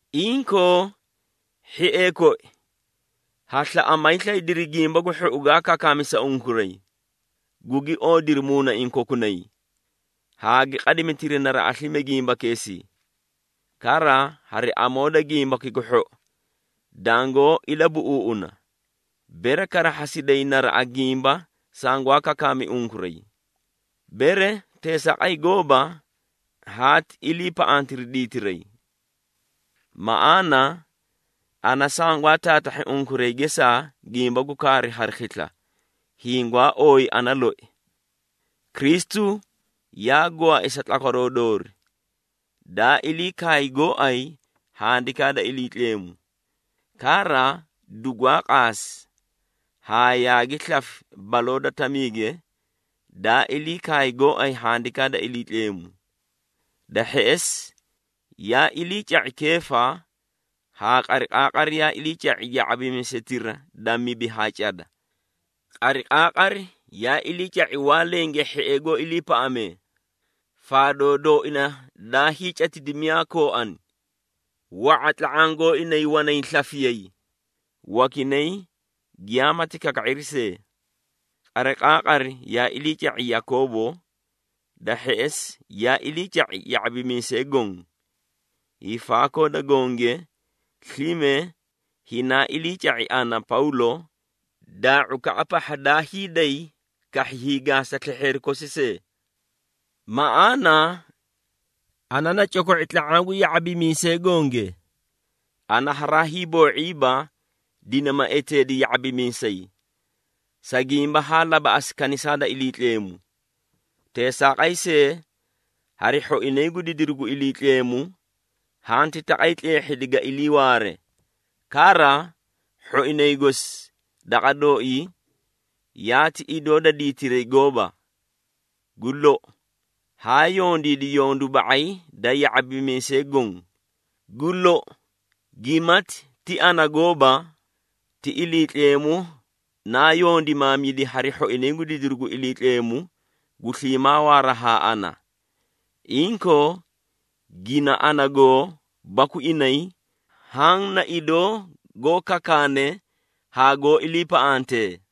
Inkoo, hhiee koi, ha slaꞌa, ma hiislaydiri Gimba gu Hhou gaa kakaami sa unkuray, gugi oodiri muunaiĩ kokunay haa gi qadimitiri naraꞌa slime gimbakeesii. Kara, hari amoo da Gimbaki gu Hhou dangoó ilabuꞌuuꞌuna, bere karahhasiday naraꞌa gimba sangwaa kakaami unkuray. Bere teesaaqay gooba, haati iliipaꞌantiri diitiray. Maꞌaana ana sangwaa taatahhi unkuray gesaa gimba gu kaaru hari khisla, hiĩ gwaa ooyi ana loi. Kristu yaa gwaai sa tlakwaroo doori, daa ilii kaay gooay Handikaa da Iliitleemu. Kara, dugwaa qaasi haa yaagi slafi baloo da tamiige, daa ilii kaay gooay Handikaa da Iliitleemu. Da hheꞌesi yaa iliica⁄i Keefa, haa qariqaaqari yaa iliica⁄i ya⁄abimiisetira da mibi haa cada. Qariqaaqari yaa iliica⁄i waa lenge hhiee goó iliipaꞌamee, faadoo dooina daa hiicatidi miyaa kooani. Wa⁄a tla⁄aã gooinay wanay slafiyay, wakinay giyamaati kaka⁄iri see. Qariqaaqari yaa iliica⁄i Yakoobo, da hheꞌesi yaa iliica⁄i ya⁄abimiisee goõ. Hiifaakoo da gonge, slime hinaa iliica⁄i ana, Pawlo, daa⁄ukaꞌa pahha daa hiiday kahhi hiigaasa slehheeri kosi see. Maꞌaana ana na coko⁄i tla⁄aã gu ya⁄abimiisee gonge, ana haraa hiiboo⁄iiba dinima eteedi ya⁄abimiisay, sa gimba haa labaꞌasi kanisaa da Iliitleemu. Teesaaqay see, hari hhoinay gu didiru gu Iliitleemu, hanti taqay tleehhidi ga iliiwaare, kara hhoinay gosi daqa dooii yaati idoo da diitiray gooba. Gu lou, haa yondiidi yondu ba⁄ay da ya⁄abimiisee goõ. Gu lou, gimati ti ana gooba, ti Iliitleemu naa yondimaamidi hari hhoinay gu didiru gu Iliitleemu gu sliimaa waara haa ana. Inkoo, gina ana goo baku inay, haã na idoo goó kakaane haa goó iliipaꞌantee.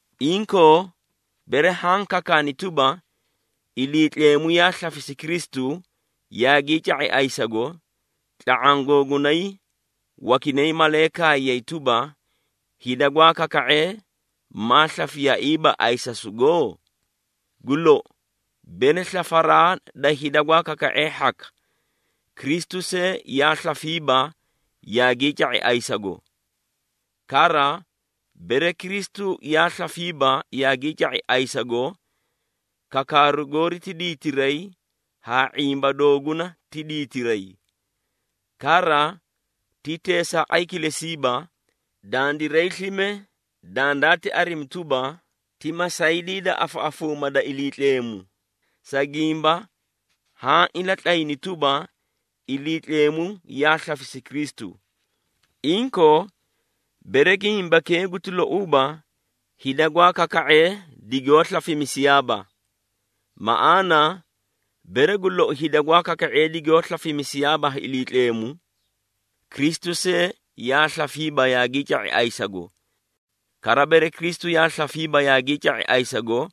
Inkoo, bere haã kakaani tuba, Iliitleemu yaa slafisi Kristu yaagii ca⁄i ayisago, tla⁄aã googunay wakinay malee kaayay tuba, hida gwaa kaka⁄ee, maa slafiyaaiiba ayisasugo? Gu lou, bere slafaraa da hida gwaa kaka⁄ee hhaka, Kristu see yaa slafiiba yaagii ca⁄i ayisago. Kara, bere Kristu yaa slafiiba yaagii ca⁄i ayisago, kakaaru goori ti diitiray haa ⁄imba dooguna ti diitiray. Kara, ti teesaaqay kilesiiba, dandiray slime dandaati arimi tuba, ti masaydii da afaꞌafuumaa da Iliitleemu, sa gimba haã ilatlayni tuba, Iliitleemu yaa slafisi Kristu. Inkoo, bere gimbakee guti louuba, hida gwaa kaka⁄ee digoó slafimisiyaaba. Maꞌaana, bere gu lou hida gwaa kaka⁄ee digoó slafimisiyaaba ha Iliitleemu, Kristu see yaa slafiiba yaagii ca⁄i ayisago. Kara, bere Kristu yaa slafiiba yaagii ca⁄i ayisago,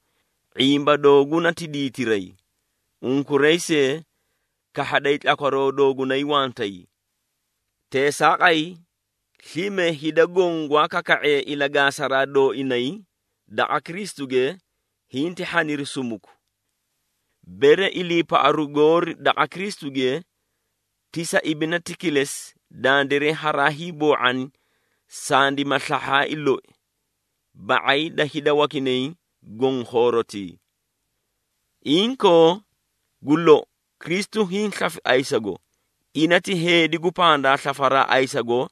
⁄imba dooguna ti diitiray, unkuray see kahhaday tlakwaroo doogunay wantay. Teesaaqay, slime hida goõ gwaa kaka⁄ee ilagaasaraa dooinay daqa Kristuge hinti hhaniri sumuku. Bere iliipaꞌaru goori daqa Kristuge ti sa ibinati kilesi, dandiray haraa hiiboo⁄ani sandima slahhaai loi ba⁄ay da hida wakinay goõ khoorotii. Inkoo, gu lou, Kristu hiĩ slafi ayisago, ina ti heedi gu pandaa slafaraa ayisago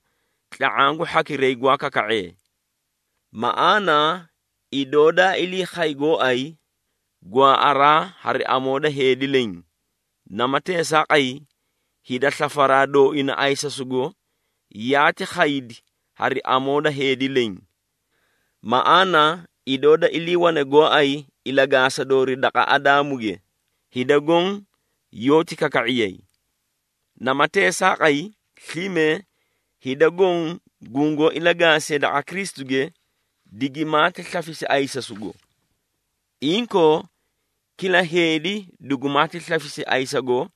tla⁄aã gu hhakiray gwaa kaka⁄ee. Maꞌaana idoo daa ilii khay gooay gwaaꞌaraa hari amoo da heedi leẽ, nama teesaaqay, hida slafaraa dooina ayisasugo yaati khaydi hari amoo da heedi leẽ. Maꞌaana idoo da iliiwane gooay ilagaasa doori daqa Adaamuge, hida goõ yoóti kaka⁄iyay. Nama teesaaqay, slime hida goõ gungoó ilagaasee daqa Kristuge, digimaati slafisi ayisasugo. Inkoo, kila heedi dugumaati slafisi ayisago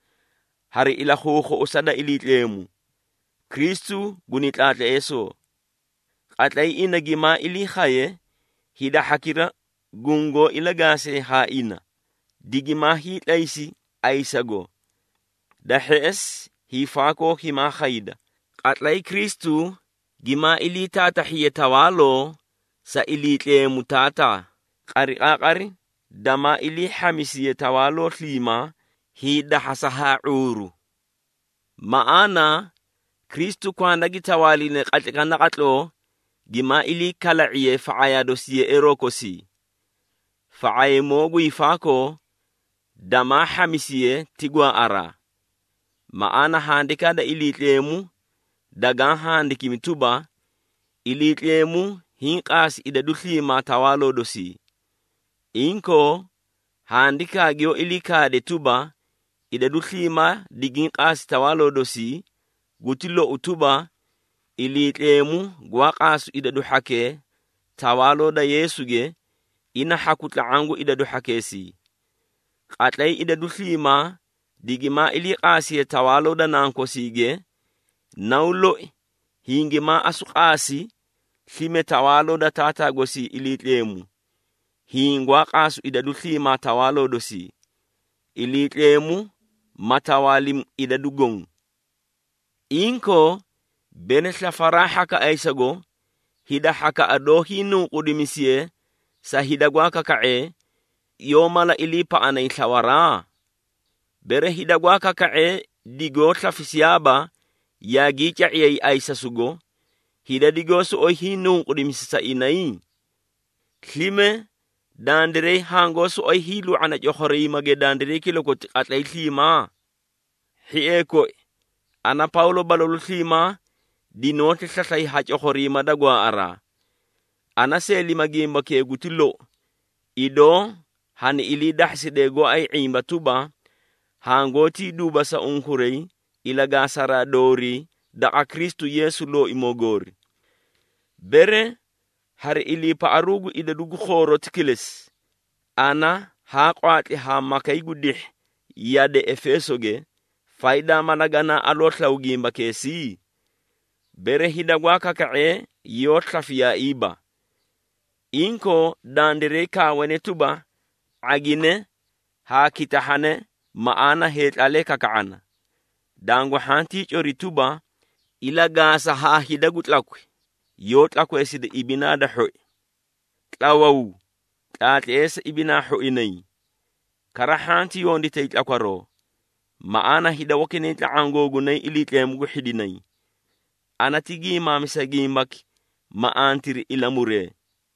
hari ilakhuukhuꞌusa da Iliitleemu. Kristu guni tlaatleesoo. Qatlay ina gimaa ilii khaye, hida hhakira gungoó ilagaasee haa ina, digimaa hiitlaysi ayisago. Da hheꞌesi, hiifaakoo himaa khayda, qatlay Kristu gimaa ilii taatahhiye tawaaloo sa Iliitleemu Taataa, qariqaaqari damaa ilii hhamisiye tawaaloo sliimaa, hiidahhasa haa ⁄uuru. Maꞌaana, Kristu kwanda gi tawaaline qatlaykaꞌa naqatloo gimaa ilii kala⁄iye fa⁄ayaa dosi yeꞌeeroo kosii. Fa⁄aymoo gu hiifaakoo damaa hhamisiye ti gwaaꞌaraa. Maꞌaana Handikaa da Iliitleemu dagaã handikimi tuba, “Iliitleemu hiĩ qaasi idadu sliimaa tawaaloo dosii.” Inkoo, handikaa giyoó ilii kaade tuba, “Idadu sliimaa digiĩ qaasi tawaaloo dosii,” guti lou tuba, Iliitleemu gwaa qaasu idadu hhakee tawaaloo da Yeesuge, ina hhaku tla⁄aã gu idadu hhakeesii. Qatlay idadu sliimaa digimaa ilii qaasiye tawaaloo da Nankosiige, Naw loi hingimaa asu qaasi slime tawaaloo da Taataa gosii Iliitleemu, hiĩ gwaa qaasu idadu sliimaa tawaaloo dosii, Iliitleemu ma tawaalimi idadu goõ. Inkoo, bere slafaraa hhaka ayisago, hida hhakaꞌa doó hiinunqudimisiye sa hida gwaa kaka⁄ee, yoó mala iliipaꞌanay slawaraa? Bere hida gwaa kaka⁄ee digoó slafisiyaaba yaagii ca⁄iyay ayisasugo, hida digoó soꞌoyi hiinunqudimisi sa inay? Slime dandiray hangoó soꞌoyi hiilu⁄ana cokhoriimage dandiray kilakoti qatlay sliimaa? Hhiee koi, ana Pawlo balalu sliimaa dinoóti slaslay ha cokhoriima da gwaaꞌaraa. Ana seelima gimbakee guti lou, idoo hani ilii dahhasidee gooay ⁄imba tuba, hangoótii duuba sa unkuray ilagaasaraa doorii daqa Kristu Yeesu Looimoo goori. Bere hari iliipaꞌaru gu idadu gu khooroti kilesi, ana haa qwaatli haa makay gu dihhi yade Efeesoge, faydaa mala ganaa aloo slaw gimbakeesii? Bere hida gwaa kaka⁄ee yoó slafiyaaiiba. Inkoo, dandiray kaawane tuba, “⁄agine haa kitahhane, maꞌaana heetlaalee kaka⁄ana.” Dangu hhantii cori tuba, “Ilagaasa haa hida gu tlakwi, yoó tlakweesida ibinaa da hhoi.” Tlawaw! Tlaatleesa ibinaa hhoinay, kara hhanti yonditay tlakwaroo. Maꞌaana hida wakinay tla⁄aã googunay Iliitleemu gu hhidinay. Ana ti giimaamisa gimbaki, ma antiri ilamuree.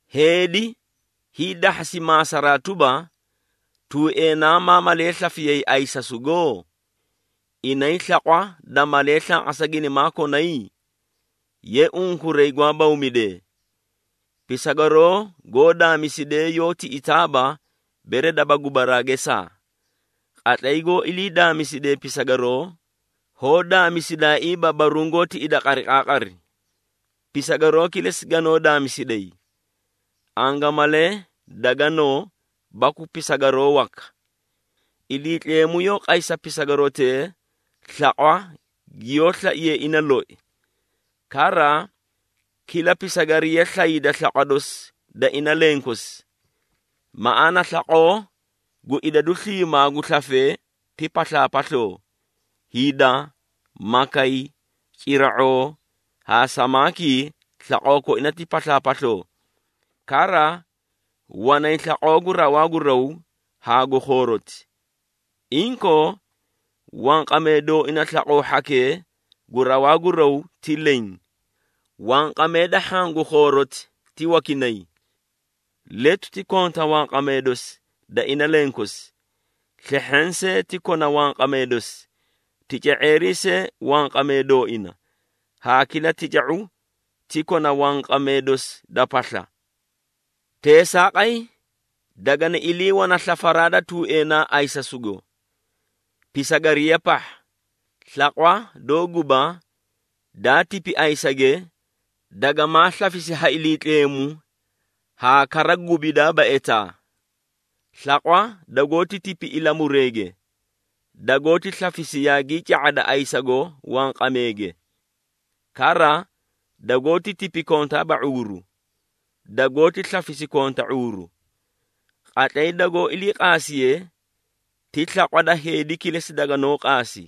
Heedi hiidahhasi maasaraa tuba, “Tuueenaa maa malee slafiyay ayisasugo? Inay slaqwa da malee slanqasa ginimaa konay?” Ye, unkuray gwaa bawmidee! Pisagaroo goó daamisidee yoó tiꞌitaaba, bere daba gubaraa gesaa. Qatlay goó ilii daamisidee pisagaroo, hoó daamisidaaiiba baruũ goó tiꞌida qariqaaqari. Pisagaroo kilesi ganoó daamisiday, angamalee da ganoo baku pisagaroo waka. Iliitleemu yoó qay sa pisagarotee slaqwa giyoó slaiye ina loi. Kara, kila pisagariya slayda slaqwa dosi da ina lenkosi. Maꞌaana slaqoo gu idadu sliimaa gu slafee ti paslaapasloo. Hida, makay, cira⁄oo haa samaakii slaqoo koina ti paslaapasloo. Kara, wanay slaqoo gu rawaa gu raw haa gu khooroti. Inkoo, wanqamee dooina slaqoo hhakee gu rawaa gu raw ti leẽ. Wanqamee da hhaã gu khooroti ti wakinay. Letu ti konta wanqamee dosi da ina lenkosi, slehheẽ see ti kona wanqamee dosi, tica⁄eerii see wanqamee dooina, haa kila tica⁄u ti kona wanqamee dosi da pasla. Teesaaqay dagani ilii wana slafaraa da tuueenaa ayisasugo. Pisagariya pahha, slaqwa doó guba, daa tipi ayisage, dagamaa slafisi ha Iliitleemu haa kara gubidaaba etaa. Slaqwa dagoóti tipi ilamureege, dagoóti slafisi yaagii ca⁄ada ayisago wanqameege. Kara, dagoóti tipi kontaaba ⁄uuru, dagoóti slafisi konta ⁄uuru. Qatlay dagoó ilii qaasiye, ti slaqwa da heedi kilesi daganoó qaasi,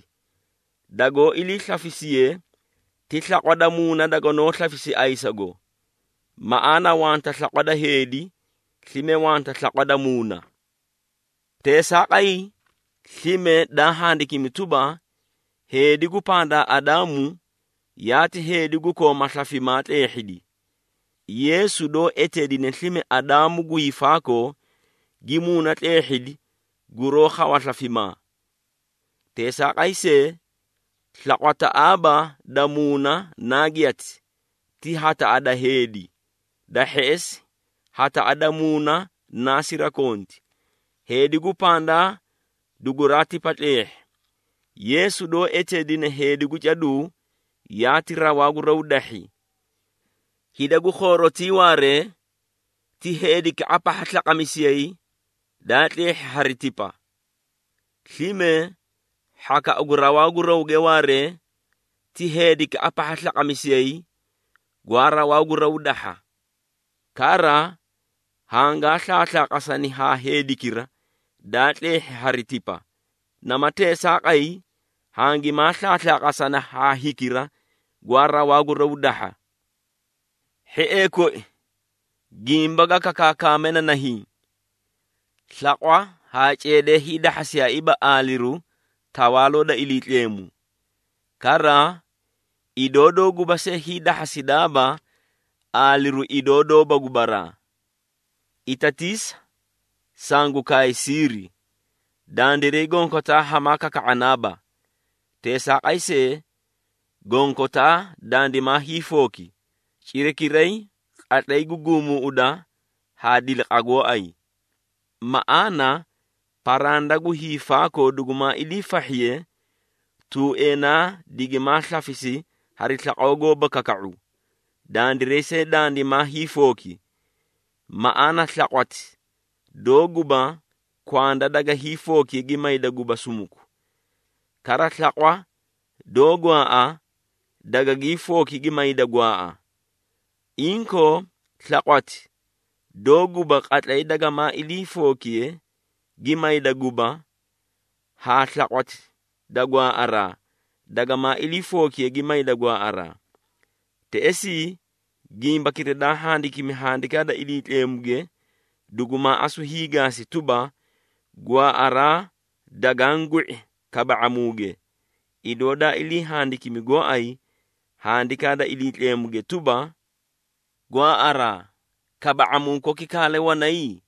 dagoó iliislafisiye, ti slaqwa da muuna daganoó slafisi ayisago. Maꞌaana wanta slaqwa da heedi, slime wanta slaqwa da muuna. Teesaaqay, slime daa handikimi tuba, “Heedi gu pandaa Adaamu, yaati heedi gu kooma slafimaa tleehhidi.” Yeesu doó eteedine slime Adaamu gu hiifaakoo, gi muuna tleehhidi guroó khawa slafimaa. Teesaaqay see, slaqwataꞌaaba da muuna naa giyati, ti hataꞌa da heedi, da hheꞌesi hataꞌa da muuna naa sirakonti. Heedi gu pandaa duguraa tipa tleehhi. Yeesu doó eteedine heedi gu caduu yaati rawaa gu raw dahhi. Hida gu khoorotii waaree, ti heedikaꞌa pahha slanqamisiyay, daa tleehhi hari tipa. Slime hhakaꞌa gu rawaa gu rawge waaree, ti heedikaꞌa pahha slanqamisiyay, gwaa rawaa gu raw dahha. Kara, hangaa slaaslaaqasani haa heedikira, daa tleehhi hari tipa, nama teesaaqay hangimaa slaaslaqasana haa hikira, gwaa rawaa gu raw dahha. Hhiee koi, gimba ga kakaakame na nahiĩ. Slaqwa haa ceedee hiidahhasiyaaiiba aaliru Tawaaloo da Iliitleemu. Kara, idoo doó guba see hiidahhasidaaba aaliru idoo doóba gubaraa. Itatiisa! Sangu kaay siiri. Dandiray gonkotaa hamaa kaka⁄anaaba. Teesaaqay see, gonkotaa dandimaa hiifooki, cirakiray, qatlay gu guumuuꞌuda haa diliqa gooay. Maꞌaana paranda gu hiifaakoo dugumaa iliifahhiye, tuueenaa digimaa slafisi hari slaqoo goóba kaka⁄u, dandiray see dandimaa hiifooki. Maꞌaana slaqwati doó guba kwanda daga hiifookiye gi mayda guba sumuku. Kara slaqwa doó gwaaꞌa, dagagii fooki gi mayda gwaaꞌa. Inkoo, slaqwati doó guba qatlay dagamaa ilii fookiye gi mayda guba, haa slaqwati da gwaaꞌaraa, dagamaa ilii fookiye gi mayda gwaaꞌaraa. Teꞌesii, gimbakira daa handikimi Handikaa da Iliitleemuge, dugumaa asu hiigaasi tuba, “Gwaaꞌaraa dagaã gwi⁄i kaba⁄amuuge.” Idoo daa ilii handikimi gooay Handikaa da Iliitleemuge tuba, “Gwaaꞌaraa, kaba⁄amuu koki kaale wanay?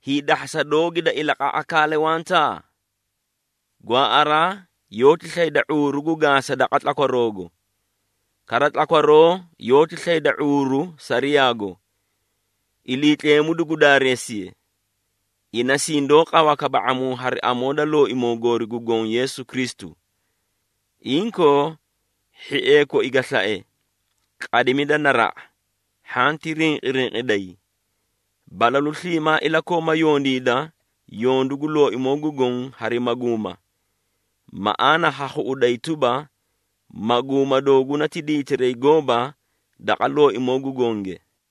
Hiidahhasa doogi da ilaqaꞌa kaale wanta?” Gwaaꞌaraa yoóti slayda ⁄uuru gu gaasa daqa tlakwaroogo. Kara tlakwaroo yoóti slayda ⁄uuru Sariyaago. Iliitleemu dugu daareesiye! Ina sindoó qawa kaba⁄amuu hari amoo da Looimoo goori gu Goõ Yeesu Kristu. Inkoo, hhiee koi ga slae, qadimida naraꞌa, hhanti rinqirinqiday. Balalu sliimaa ilakooma yondiida yondu gu Looimoo gu Goõ hari maguuma. Maꞌaana ha khuꞌuday tuba, maguuma dooguna ti diitiray gooba daqa Looimoo gu Gonge.